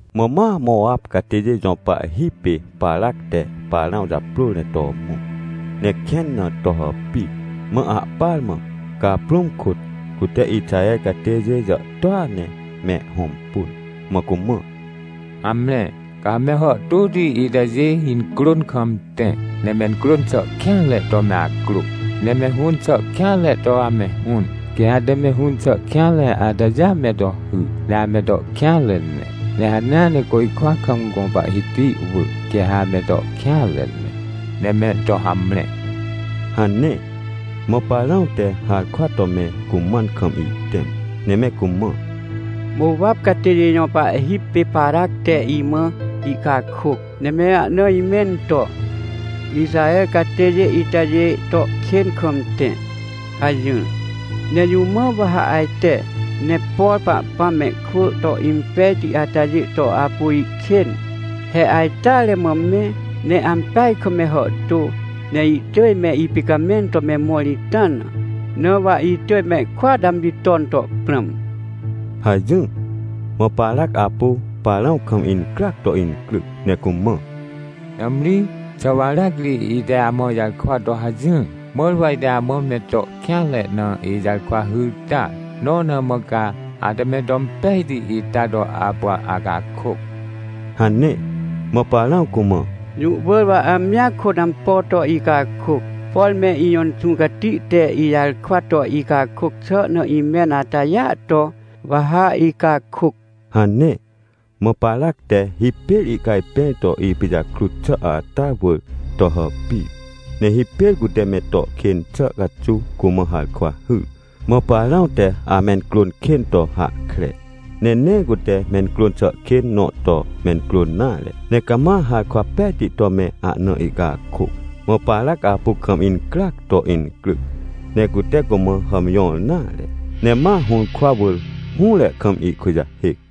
Mã ma Mowap catêjê jõ pahhi pê Parac te Parãw japrôr ne to mõ, ne kẽn na to hàpir. Mã ahpar mã, caprũm kôt, cute Ixaher catêjê jàhtôa ne me hõmpun. Mã cumã: — Hamre, ca ha me hàhtôti itajê incrôn kam tẽ, ne mencrôn xà kêanre to me acrô. Ne me hũn xà kêanre to ame hũn, quê ha ate me hũn xà kêanre atajêa me to hy, ne ame to kêanre ne. Ne hanea ne côjkwa kam gõ Pahhiti wỳ, quê ha ame to kêanre ne, ne me to hamre — hane. Mã Parãw te harkwa to me cumãn kam ihtẽm, ne me cumã: — Mowap catêjê jõ pahhi pê Parac te imã ihcakôc, ne me ahna imẽn to: “Ixaher catêjê itajê to kên kam tẽ” hajỹr. Ne jũ mã wa ha ajte, ne por Pahpãm mehkwỳ to impejti atajê to apu ihkên? He ajteare mã me, ne ampeaj kam me hàhtô, ne ihtỳj me ipicamẽn to me mõr ita na. Na wa itỳj mehkôat amji ton to prãm — hajỹr. Mã Parac apu Parãw kam incryac to incryc ne cumã: — Nãmri! Xà wa aracri ite amã ijarkwa to hajỹr? Mãr wa ite amã me to kêanre na ijarkwa hyr ta! Nõ na mã ca ate me to impejti ita to apu acakôc! — hane. Mã Parãw cumã: — Jũ wỳr wa amjia kôt ampo to icakôc, por me ijõ Inxũ Cati te ijarkwa to icakôc xà na imẽn atajêa to, wa ha icakôc — hane. Mã Parac te hipêr ihcajpẽr to ipijakrut xà ata wỳr to hàpir, ne hipêr cute me to kên xà caxuw cumã harkwa hyr. Mã Parãw te amencrôn kên to hahkre, ne nee cute mencrôn xà kên nõ to mencrôn nare, ne cama harkwa pejti to me ahna ihcakôc. Mã Parac apu kam incryac to incryc, ne cute cumã hàmjõr nare, ne ma hũrkwa wỳr, hũre kam ihkujahêc.